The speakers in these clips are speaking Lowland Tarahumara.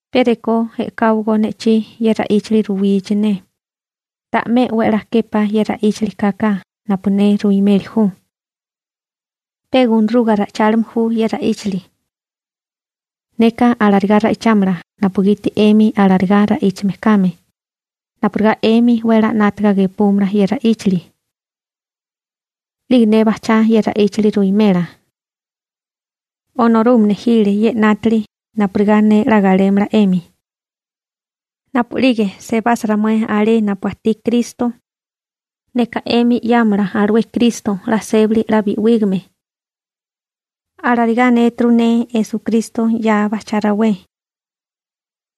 Pe rekó e'káwagó ne'chí ye ra'íchali ruwichi ne, ta'mé 'we a'lá képá ye ra'íchali kaka napu ne ruimeli ju. Pe gunaruga ra'ichálime ju ye ra'íchali. Neka alarigá ra'ichámala napugiti 'emi alarigá ra'íchame kame, napurigá 'emi 'we a'lá 'nátaga gepúmala ye ra'íchali. 'Lige ne bajchá ye ra'íchali ruwimela. Onorúgame nejile ye 'nátili napurigá ne 'la galémala 'emi. Napu'lige sebasa ramué alé napu ajtí Kristo, neka 'emi 'yámolá alué Kristo 'la sébali 'la bi'wígame. Alarigá anéturu ne Esukristo 'ya bajchabé rawé.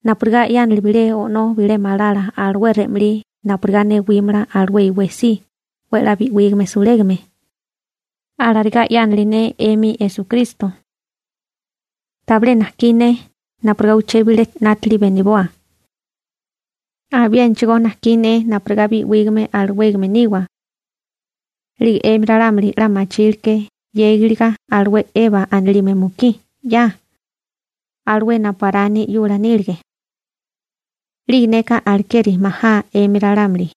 Napurigá 'yánili bilé o'nó bo'né malala alué re'malí napurigá newímala alué iwé si 'we 'la bi'wígame sulégame, alarigá 'yánili ne 'emi Esukristo. Tabilé najkí ne napurigá uché bilé 'nátili beniboa. Abiénachigó najkí ne napurigá bi'wígame alawégame niwa. 'Lige 'emi ralámuli 'la machíleké 'yégiliga alué Eba anilime mukí 'ya, alué napu Arani 'yula nílige. 'Lige neka alekeri majá 'emi ralámuli,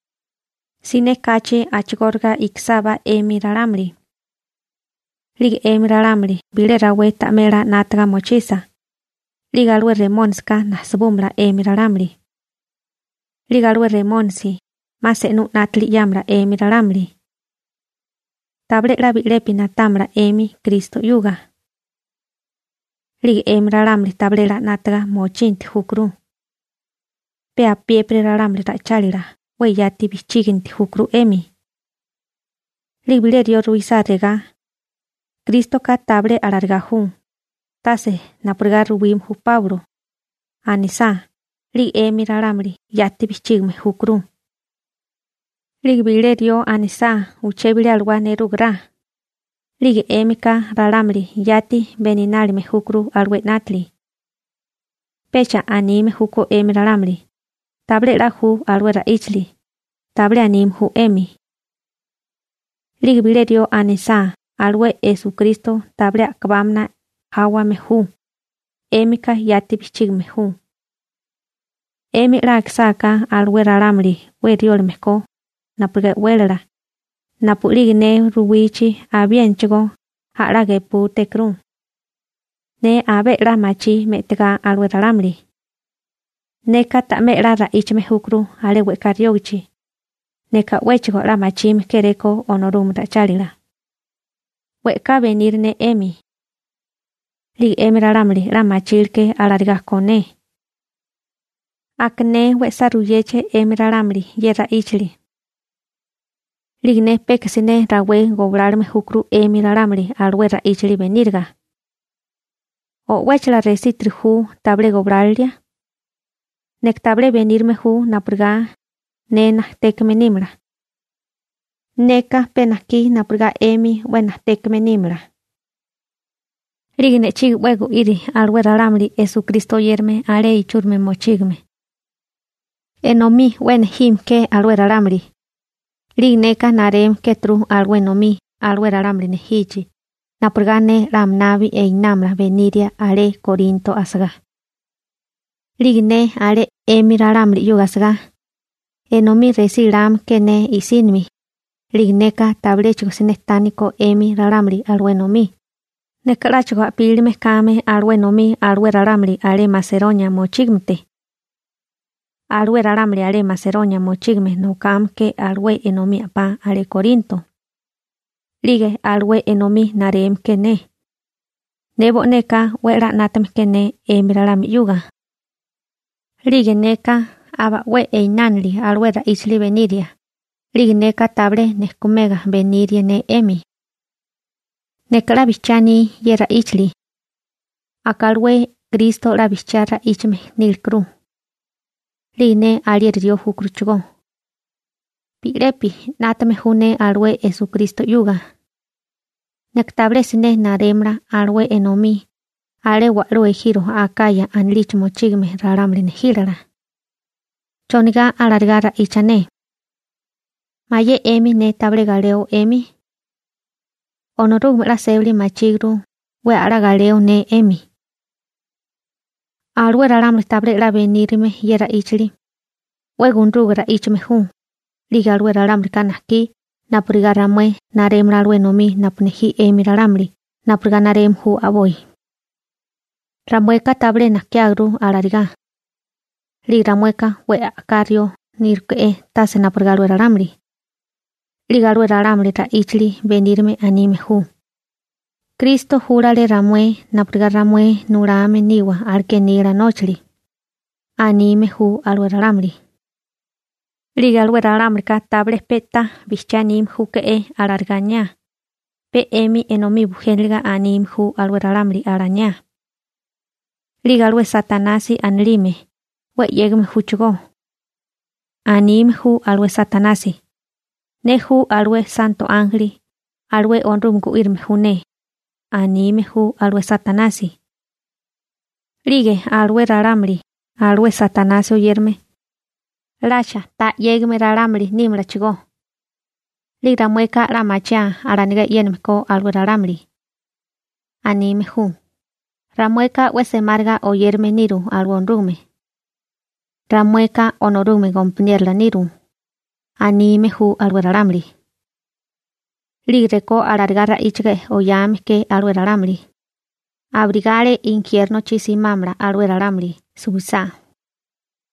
siné kachi a'chigóriga ikisábá 'emi ralámuli. 'Lige 'emi ralámuli bilé rawé ta'mé 'la 'nátaga mochisa, 'lige alué Remónisika nasibúmala 'emi ralámuli. 'Lige alué Remónisi 'ma se'nú 'nátili 'yámala 'emi ralámuli. Tabilé 'la bi'lepi na'támala 'emi Kristo 'yuga. 'Lige 'emi ralámuli tabilé 'la 'nátaga mochinti júkuru. Pe apiépiri ralámuli ra'ichálila 'we yati bijchíginti júkuru 'emi. 'Lige bilé rió ruisá regá: «Krístoka tabilé alarigá ju, tase napurigá ruwime ju Páulo», anisá, 'lige 'emi ralámuli yati bijchígame júkuru. 'Lige bilé rió anisá uché bilé alawá nerúgará, 'lige 'émika ralámuli yati beninálime júkuru alué 'nátili. Pecha anime júkó 'emi ralámuli: «Tabilé 'la ju alué ra'íchali», tabilé anime ju 'emi. 'Lige bilé rió anisá alué Esukristo tabilé a'kabámana jáwame ju, 'émika yati bijchígame ju. 'Emi 'la akisáká alué ralámuli 'we riólame ko napurigá e'wélala, napu'lige ne ruwichi abiénachigó a'lá gepútékuru. Ne abé 'la machí me'tigá alué ralámuli. Neka ta'mé 'la ra'íchame júkuru alé we'ká riógachi, neka 'wéchigo 'la machime kéréko Onorúgame ra'ichálila, we'ká beniri ne 'emi. 'Lige 'emi ralámuli 'la machíleké alarigá ko ne. Aka ne we'sá ruyéché 'emi ralámuli ye ra'íchali. 'Lige ne peka siné rawé goblálome júkuru 'emi ralámuli alué ra'íchali beníriga. ¿O'wéchala resitiri ju tabilé goblálilia? Neka tabilé benírime ju napurigá ne najtékame nímala. Neka pe najkí napurigá 'emi 'we najtékame nímala. 'Lige ne'chí 'we gu'iri alué ralámuli Esukristo oyérame alé ichúrimi mochígame. Enomí 'we nejime ke alué ralámuli, 'lige neka nareme kéturu alué enomí alué ralámuli nejichi napurigá ne 'la aminabi einámala beniria alé Korinto asagá. 'Lige ne alé 'emi ralámuli 'yuga asagá, enomí resí lame ke ne i'sínimi, 'lige neka tabiléchigo siné tániko 'emi ralámuli enomí, neka 'láchigo a'pílime kame alué enomí alué ralámuli alé Maseronia mochígamete. Alué ralámuli alé Maseronia mochígame nokame ke alué enomí a'pá alé Korinto, 'lige alué enomí nareme ke ne. Ne bo'neka 'we a'lá 'nátame ke ne 'emi ralámuli 'yuga. 'Lige neka aba 'we inánili alué ra'íchali beniria, 'lige neka tabilé nejkumega benírie ne 'emi. Neka 'la bijchiá aní ye ra'íchali. Aka alué Kristo 'la bijchiá ra'íchame nílekuru. 'Lige ne alieri rió júkuruchigó. Bi'lepi 'nátame ju ne alué Esukristo 'yuga. Neka tabilé siné narémala alué enomí alé wa'lú ejiro Akaya anilichi mochígame ralámuli nejílala. ¿Chonigá alarigá ra'icha ne? ¿Mayé 'emi ne tabilé galeo 'emi? Onorúgame 'la sébali machíguru 'we a'lá galeo ne 'emi. Alué ralámuli tabilé 'la benírime ye ra'íchali, 'we gunaruga ra'íchame ju, 'lige alué ralámulika najkí napurigá ramué narémala alué enomí napu nejí 'emi ralámuli napurigá nareme ju a'boi. Ramueka tabilé nakiáguru alarigá. 'Lige ramueka 'we a'ká rió níruke'é tase napurigá alué ralámuli. 'Lige alué ralámuli ra'íchali benírame anime ju: «Kristo júlale ramué napurigá ramué nulame niwa aleké nila nóchali», anime ju alué ralámuli. 'Lige alué ralámulika tabilé pe'tá bijchiá anime júke'é alarigá alaniá, pe 'emi enomí bujéniliga anime ju alué ralámuli alaniá. 'Lige alué Satanasi anilime 'we 'yégame júchigó. Anime ju alué Satanasi: «Ne ju alué santo ánjeli, alué Onorúgame gu'írame ju ne», anime ju alué Satanasi. 'Lige alué ralámuli alué Satanasi oyérame, ¿'lacha ta 'yégame ralámuli nímalachigó? 'Lige ramueka 'la machiáa alanigá e'yéname ko alué ralámuli. Anime ju: «Ramueka 'we semáriga oyérame niru alué Onorúgame. Ramueka Onorúgame gompaniérola niru», anime ju alué ralámuli. 'Lige rekó alarigá ra'íchaga oyame ke alué ralámuli, abirigá alé injiérnochi simámala alué ralámuli suwisá,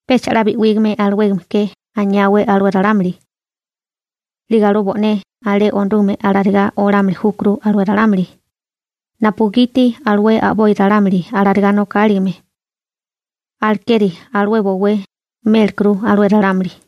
pecha 'la bi'ígame alawégame ke aniáwé alué ralámuli. 'Lige alué bo'né alé Onorúgame alarigá olámili júkuru alué ralámuli, napugiti alué a'boi ralámuli alarigá nokáligame. Alekeri alué bowé mélekuru alué ralámuli.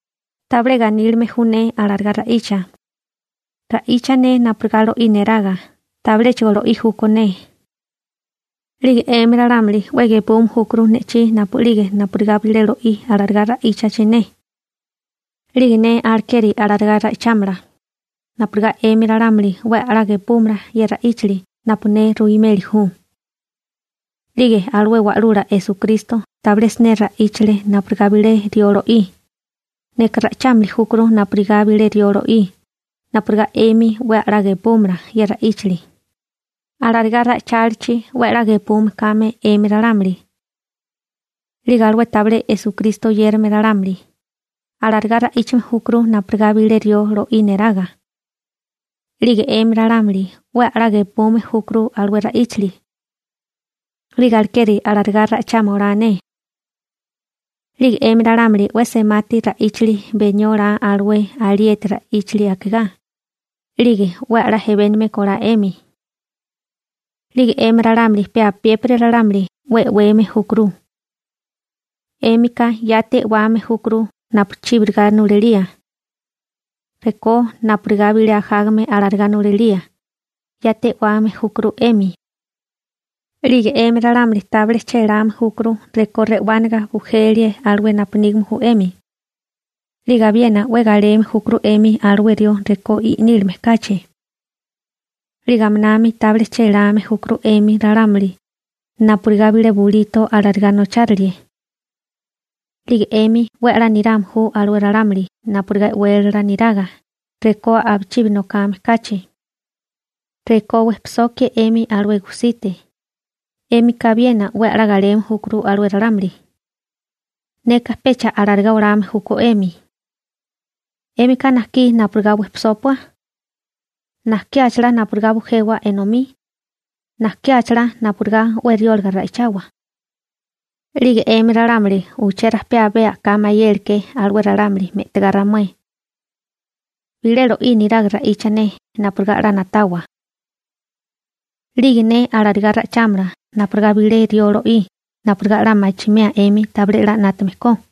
Tabilé ganílime ju ne alarigá ra'icha. Ra'icha ne napurigá lo'í neraga, tabiléchigo lo'í júkó ne. 'Lige 'emi ralámuli 'we gepume júkuru ne'chí napu'lige napurigá bilé rió lo'í alarigá ra'íchachi ne. 'Lige ne alekeri alarigá ra'ichámala, napurigá 'emi ralámuli 'we a'lá gepúmala ye ra'íchali napu ne ruimeli ju. 'Lige alué Wa'lula Esukristo tabilé siné ra'íchale napurigá bilé rió lo'í, neka ra'ichámili júkuru napurigá bilé rió lo'í napurigá 'emi 'we a'lá gepúmala ye ra'íchali, alarigá ra'ichálichi 'we a'lá gepume kame 'emi ralámuli. 'Lige alué tabilé Esukristo oyérame ralámuli, alarigá ra'íchame júkuru napurigá bilé rió lo'í neraga. 'Lige 'emi ralámuli 'we a'lá gepume júkuru alué ra'íchali. 'Lige alekeri alarigá ra'ichama olá ne. 'Lige 'emi ralámuli 'we semati ra'íchali benió olá alué alieti ra'íchali akigá, 'lige 'we a'lá ejebénigame kólá 'emi. 'Lige 'emi ralámuli pe apiépiri ralámuli 'we e'weme júkuru. 'Émika yati e'wame júkuru napu chíbiriga nulalíe. Rekó napurigá bilé ajágame alarigá nulalíe, yati e'wame júkuru 'emi. 'Lige 'emi ralámuli tabilé chéláme júkuru rekó re'wániga bujilíe alué napu nígame ju 'emi. 'Lige abiena 'we galeme júkuru 'emi alué rió rekó i'nílime kachi. 'Lige aminami tabilé chéláme júkuru 'emi ralámuli napurigá bilé bulito alarigá nochárilie. 'Lige 'emi 'we a'lá nirame ju alué ralámuli napurigá e'wélala neraga rekó napuchibi nokame kachi. Rekó wejpisokie 'emi alué gujsite, 'émika abiena 'we 'la galeme júkuru alué ralámuli. Neka pecha alarigá olame júkó 'emi. ¿'Émika najkí napurigá wejpisópua? ¿Najkiáchalá napurigá bujewa enomí? ¿Najkiáchalá napurigá 'we riólaga ra'ichawa? 'Lige 'emi ralámuli uché rajpé abé a'ká mayele ke alué ralámuli me'tagá ramué. Bilé lo'í niraga ra'icha ne, napurigá 'la na'tawa. 'Lige ne alarigá ra'ichámala napurigá bilé rió lo'í napurigá 'la machimea 'emi tabilé 'la 'nátame ko.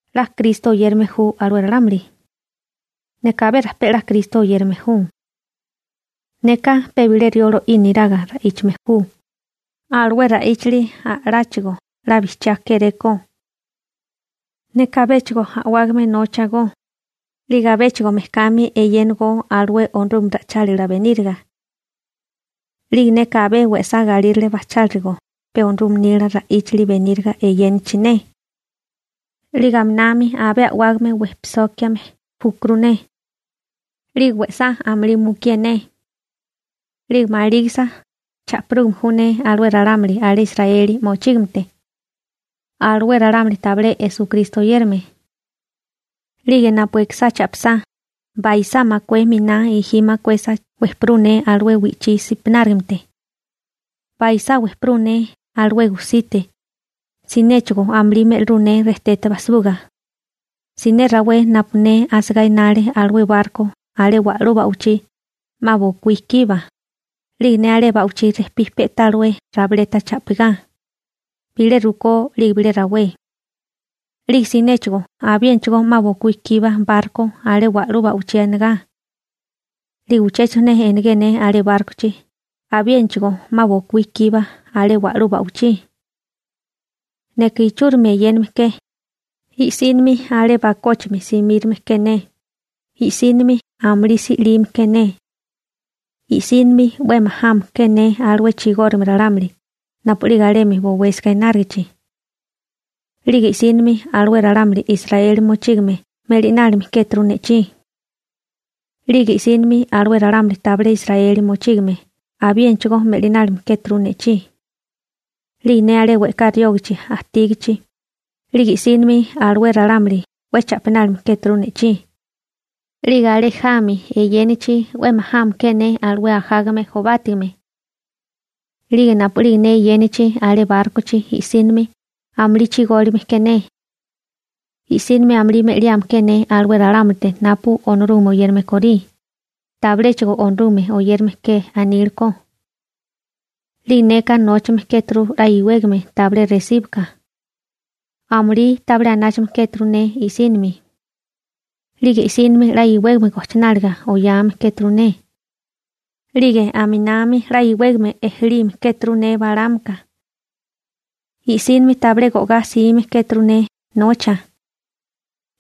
¿'La Kristo oyérame ju alué ralámuli? Neka abé rajpé 'la Kristo oyérame ju. Neka pe bilé rió lo'í neraga ra'íchame ju, alué ra'íchali a'láchigo 'la bijchiá kéréko. Neka abéchigo a'wágame nóchagó, 'lige abéchigo mejkami eyénagó alué Onorúgame ra'ichálila beníriga. 'Lige neka abé we'sá galírale bajchilígó pe Onorúgame nila ra'íchali beníriga eyénachi ne. 'Lige aminami abé a'wágame wejpisókiame júkuru ne. 'Lige we'sá amulí mukié ne. 'Lige malígisa cha'pirúgame ju ne alué ralámuli alé Israeli mochígamete, alué ralámuli tabilé Esukristo oyérame. 'Lige napu ikisá cha'pisá, baisá makué miná gi makuesa wejpirú ne alué wi'chí si'pinárigamete. Baisá wejperú ne alué gusite. Sinéchigo amulí me'lirú ne rejtete bajsibuga. Siné rawé napu ne asagá enale alué barko alé wa'lú ba'wichí, 'ma bokuí kiba, 'lige ne alé ba'wichí rejpí pe'tá alué rabileta cha'pigá, bilé rukó 'lige bilé rawé. 'Lige sinéchigo abiénachigó 'ma bokuí kiba barko alé wa'lú ba'wichí enagá. 'Lige uchéchigo siné enegé ne alé bárkochi abiénachigó 'ma bokuí kiba alé wa'lú ba'wichí. Neka ichúrimi eyéname ke, i'sínimi alé bakóchimi simírome ke ne, i'sínimi amulí si'lime ke ne. I'sínimi 'we majame ke ne alué chigórigame ralámuli napu'lige alemi bowésiga enárigichi. 'Lige i'sínimi alué ralámuli Israeli mochígame me'linálime kéturu ne'chí. 'Lige i'sínimi alué ralámuli tabilé Israeli mochígame abiénachigó me'linálime kéturu ne'chí. 'Lige ne alé we'ká riógichi ajtígichi, 'lige i'sínimi alué ralámuli 'we cha'pinálime kéturu ne'chí. 'Lige alé jami eyénachi, 'we majame ke ne alué ajágame jobátigame. 'Lige napu'lige ne eyénachi alé bárkochi i'sínimi amulí chigólime ke ne. I'sínimi amulí me'liame ke ne alué ralámulite napu Onorúgame oyérame korí, tabiléchigo Onorúgame oyérame ke anile ko. 'Lige neka nóchame kéturu 'la iwégame tabilé resíbika. Amulí tabilé anáchame kéturu ne i'sínimi. 'Lige i'sínimi 'la iwégame gojchináliga oyame kéturu ne. 'Lige aminami 'la iwégame ejelime kéturu ne balámaka. I'sínimi tabilé go'gá 'sime kéturu ne nocha.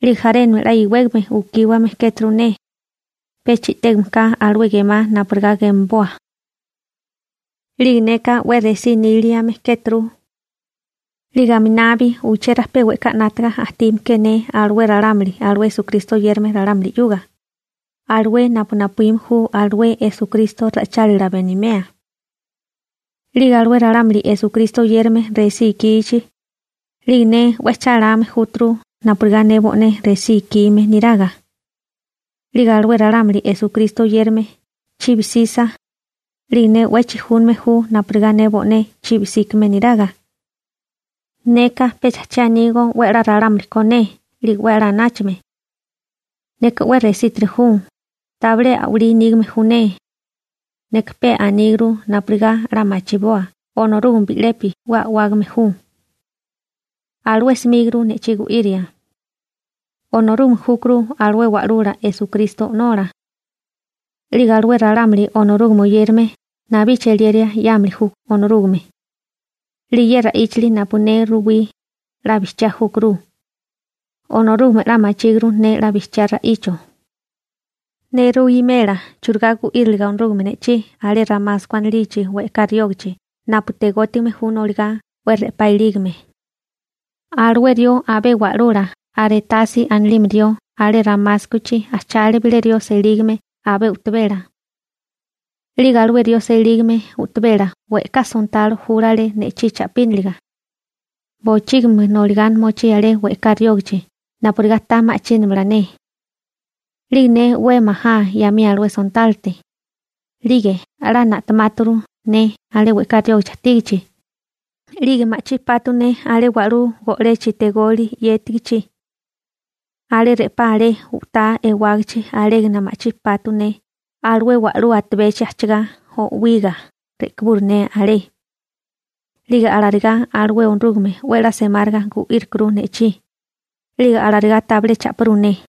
'Lige jarénami 'la iwégame ukíwame kéturu ne, pecha i'tégame ka alué gemá napurigá gemaboa. 'Lige neka 'we resí níliame kéturu. 'Lige aminabi uché rajpé we'ká 'nátaga ajtime ke ne alué ralámuli alué Esukristo oyérame ralámuli 'yuga, alué napu napuíme ju alué Esukristo ra'ichálila benimea. 'Lige alué ralámuli Esukristo oyérame resí ikichi, 'lige ne 'we cháláme júturu napurigá ne bo'né resí ikime niraga. 'Lige alué ralámuli Esukristo oyérame chibi 'sisa, 'lige ne 'we chijúname ju napurigá ne bo'né chibi 'síkame niraga. Neka pecha che anígó 'we 'la ralámuli ko ne 'lige 'we 'la anáchame. Neka 'we resítiri ju, tabilé a'walí nígame ju ne. Neka pe aníguru napurigá 'la machiboa Onorúgame bi'lepi 'we a'wágame ju. Alué simíguru ne'chí gu'íria. Onorúgame júkuru alué Wa'lula Esukristo O'nola, 'lige alué ralámuli Onorúgame oyérame nabí cheliera 'yámili ju Onorúgame. 'Lige ye ra'íchali napu ne ruwí, 'la bijchiá júkuru. Onorúgame 'la machíguru ne 'la bijchiá ra'icho. Ne ruwimela churigá gu'íriliga Onorúgame ne'chí alé Ramasko anilichi we'ká riógachi napu tegótigame ju noligá 'we re'pá ilígame. Alué rió abé wa'lula Arétasi anilime rió alé Ramáskochi ajchale bilé rió selígame abé u'tabela. 'Lige alué rió selígame u'tabela we'ká sontalo júlale ne'chí cha'pínaliga. Bochígimi noligá mochí alé we'ká riógichi napurigá ta ma'chínamala ne. 'Lige ne 'we majá 'yamía alué sontálote, 'lige 'la na'temáturu ne alé we'ká riógichi ajtígichi, 'lige ma'chí pátú ne alé wa'lú go'lechi tegoli 'yétigichi. Alé re'pá alé u'tá ewágichi alégana ma'chí pátú ne alué wa'lú atabechi ajchagá o'wiga re'kiburu ne alé. 'Lige alarigá alué Onorúgame 'we a'lá semáriga gu'írikuru ne'chí, 'lige alarigá tabilé cha'pirú ne.